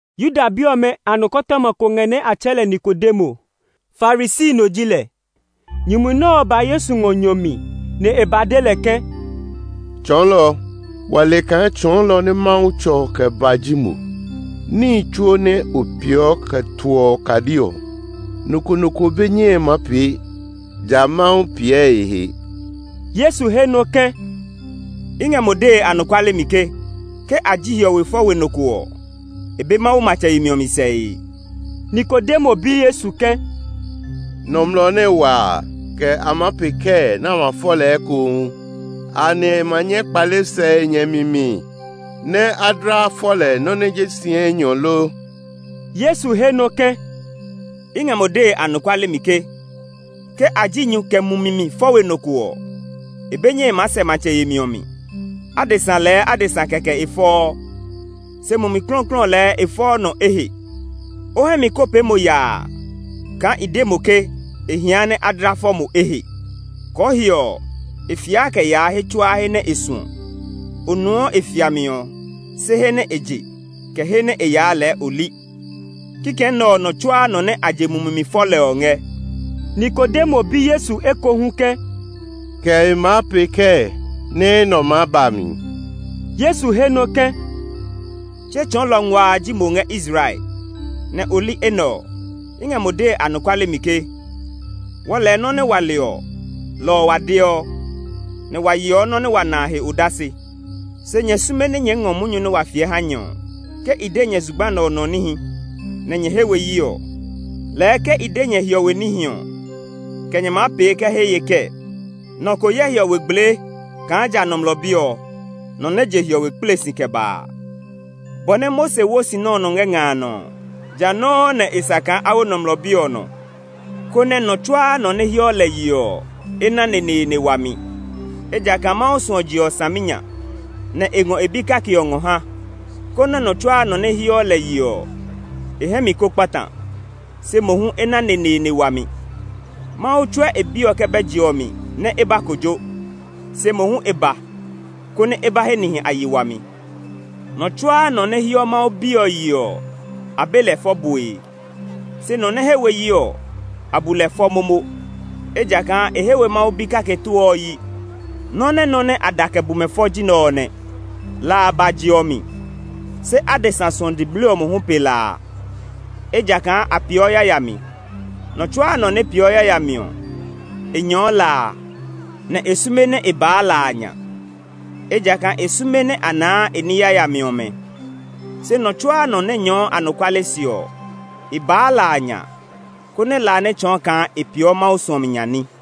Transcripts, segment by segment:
Yuda bi ɔmɛ a nɔkɔtɔma ko ngɛ nɛ a tsɛɛ lɛ Nikodemo. Farisi no ji lɛ. Nyumu nɛ ɔ ba Yesu ngɔ nyɔ mi, nɛ e ba de lɛ ke, “Tsɔɔlɔ, wa le kaa tsɔɔlɔ nɛ Mawu tsɔ kɛ ba ji mo. Níhi tsuo nɛ o peeɔ ɔ kɛ toɔ okadi ɔ, nɔ ko nɔ ko be nyɛe maa pee, ja Mawu piɛ e he.” Yesu he nɔ ke, “I ngɛ mo dee anɔkuale mi ke, ke a ji hiɔwe fɔ we nɔ ko ɔ e be Mawu matsɛ yemi ɔ mi sɛe.” Nikodemo bi Yesu ke, “Nɔmlɔ nɛ wa a, kɛ maa pee kɛɛ nɛ a ma fɔ lɛ ekohu? Anɛ e ma nyɛ kpale sɛ e nyɛ mi mi nɛ a dla fɔ lɛ nɔ nɛ ji si enyɔ lo?” Yesu he nɔ ke, “I ngɛ mo dee anɔkuale mi ke, ke a ji nyu kɛ mumi mi fɔ we nɔ ko ɔ, e be nyɛe maa sɛ matsɛ yemi ɔ mi. Adesa lɛɛ adesa kɛkɛ e fɔɔ, se Mumi Klɔuklɔu lɛɛ e fɔɔ nɔ ehe. O hɛ mi ko pee mo yaa kaa i de mo ke e hia nɛ a dla fɔ mo ehe. Kɔɔhiɔ ɔ, e fiaa kɛ yaa he tsuaa he nɛ e suɔ; o nuɔ e fiami ɔ, se he nɛ e je, kɛ he nɛ e yaa lɛɛ o li. Kikɛ nɛ ɔ nɔ tsuaa nɔ nɛ a je Mumi mi fɔ lɛ ɔ ngɛ.” Nikodemo bi Yesu ekohu ke, “Kɛ e maa pee kɛɛ nɛ enɛ ɔ maa ba mi?” Yesu he nɔ ke, “Tse tsɔɔlɔ nguaa ji mo ngɛ Israel! Nɛ o li enɛ ɔ? I ngɛ mo dee anɔkuale mi ke wɔɔ lɛɛ nɔ́ nɛ wa le ɔ, lɔ ɔ wa deɔ, nɛ wa yeɔ nɔ́ nɛ wa na a he odase. Se nyɛ sume nɛ nyɛɛ ngɔ munyu nɛ wa fiɛ ha nyɛ ɔ. Ke i de nyɛ zugba nɛ ɔ nɔ níhi nɛ nyɛ he we yi ɔ, lɛɛ ke i de nyɛ hiɔwe níhi ɔ, kɛ nyɛ maa pee kɛ he ye kɛɛ? Nɔ ko yɛ hiɔwe gblee kaa ja Nɔmlɔ Bi ɔ, nɔ nɛ je hiɔwe kple si kɛ ba a.” Bɔ nɛ Mose wo sinɔ ɔ nɔ ngɛ nga a nɔ ɔ, jã nɔuu nɛ e sa kaa a wo Nɔmlɔ Bi ɔ nɔ, konɛ nɔ tsuaa nɔ nɛ heɔ lɛ yeɔ ɔ, e na neneene wami. Ejakaa Mawu suɔ je ɔ saminya, nɛ e ngɔ e Bi kake ɔ ngɔ ha, konɛ nɔ tsuaa nɔ nɛ heɔ lɛ yeɔ ɔ, e hɛ mi ko kpata, se mohu e na neneene wami. Mawu tsɔ we e Bi ɔ kɛ bɛ je ɔ mi nɛ e ba kojo; se mohu e ba, konɛ e ba he nihi a yi wami. Nɔ tsuaa nɔ nɛ heɔ Mawu Bi ɔ yeɔ ɔ, a be lɛ fɔ bue; se nɔ nɛ he we yi ɔ, a bu lɛ fɔ momo; ejakaa e he we Mawu Bi kake too ɔ yi. Nɔ́ nɛ nɔ nɛ a da kɛ bu mɛ fɔ ji nɛ ɔ nɛ: la a ba je ɔ mi, se adesa suɔ diblii ɔ mohu pe la a, ejakaa a peeɔ yayami. Nɔ tsuaa nɔ nɛ peeɔ yayami ɔ, e nyɛɔ la a; nɛ e sume nɛ e baa la a nya, ejakaa e sume nɛ a naa e ní yayami ɔmɛ. Se nɔ tsuaa nɔ nɛ nyɛɛɔ anɔkuale se ɔ, e baa la a nya, konɛ la a nɛ tsɔɔ kaa e peeɔ Mawu suɔmi nya ní.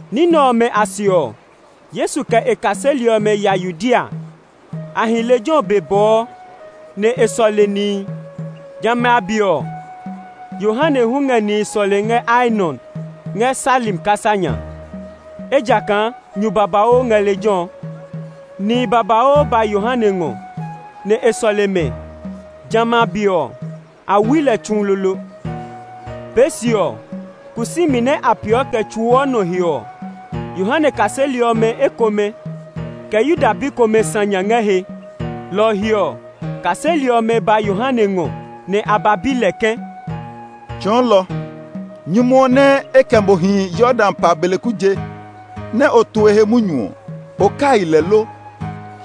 Ní nɛ ɔmɛ a se ɔ, Yesu kɛ e kaseli ɔmɛ ya Yudea. A hi lejɛ ɔ be bɔɔ, nɛ e sɔle nihi. Jamɛ a be ɔ, Yohane hu ngɛ nihi sɔlee ngɛ Aenon, ngɛ Salim kasa nya, ejakaa nyu babauu ngɛ lejɛ ɔ. Nihi babauu nitsɛnitsɛ ba e ngɔ, nɛ e sɔle mɛ. Jamɛ a be ɔ, a wui Yohane tsu lolo. Pee se ɔ, kusumi nɛ a peeɔ kɛ tsuɔ nɔ he ɔ, Yohane kaseli ɔmɛ ekomɛ, kɛ Yuda bi komɛ sã nya ngɛ he. Lɔ ɔ he ɔ, kaseli ɔmɛ ba Yohane ngɔ, nɛ a ba bi lɛ ke, “Tsɔɔlɔ, nyumu ɔ nɛ e kɛ mo hi Yordan pa a beleku je nɛ o tu e he munyu ɔ, o kai lɛ lo?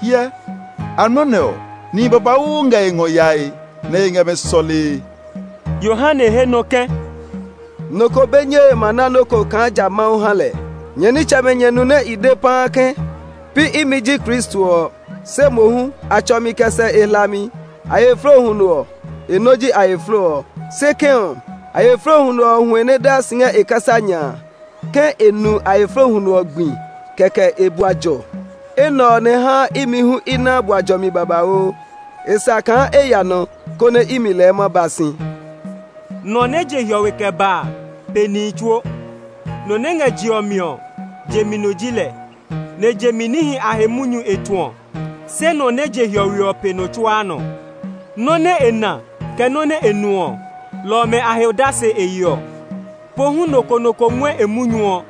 Hyɛ, amlɔ nɛ ɔ, nihi babauu ngɛ e ngɔ yae, nɛ e ngɛ mɛ sɔlee.” Yohane he nɔ ke, “Nɔ ko be nyɛe ma na nɔ́ ko kaa ja Mawu ha lɛ. Nyɛ nitsɛmɛ nyɛ nu nɛ i de paa ke, ‘Pi imi ji Kristo ɔ, se mohu a tsɔ mi kɛ sɛ e hlami’. Ayɛflo huno ɔ, e nɔ ji ayɛflo ɔ. Se kɛ̃ ɔ, ayɛflo huno ɔ huɛ nɛ daa si ngɛ e kasa nya a, ke e nu ayɛflo huno ɔ gbi kɛkɛ e bua jɔ. Enɛ ɔ nɛ haa imi hu i naa bua jɔmi babauu. E sa kaa e ya nɔ, konɛ imi lɛɛ ma ba si.” Nɔ nɛ je hiɔwe kɛ ba a pe nihi tsuo. Nɔ nɛ ngɛ je ɔ mi ɔ, je mi no ji lɛ, nɛ je mi níhi a he munyu e tuɔ. Se nɔ nɛ je hiɔwe ɔ pe nɔ tsuaa nɔ. Nɔ́ nɛ e na, kɛ nɔ́ nɛ e nu ɔ, lɔ ɔmɛ a he odase e yeɔ, pohu nɔ ko nɔ ko ngɔɛ e munyu ɔ.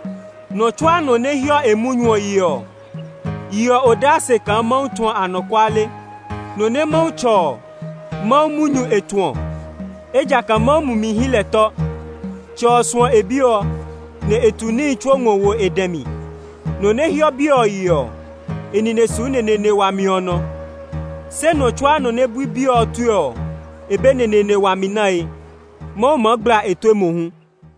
Nɔ tsuaa nɔ nɛ heɔ e munyu ɔ yeɔ ɔ, yeɔ odase kaa Mawu tuɔ anɔkuale. Nɔ nɛ Mawu tsɔ ɔ, Mawu munyu e tuɔ, ejakaa Mawu Mumi hyi lɛ tɔ. Tsɛ ɔ suɔ e Bi ɔ, nɛ e tu nihi tsuo ngɔ wo e dɛ mi. Nɔ nɛ heɔ Bi ɔ yeɔ ɔ, e nine su neneene wami ɔ nɔ; se nɔ tsuaa nɔ nɛ bui Bi ɔ tue ɔ, e be neneene wami nae. Mawu maa gbla e tue mohu.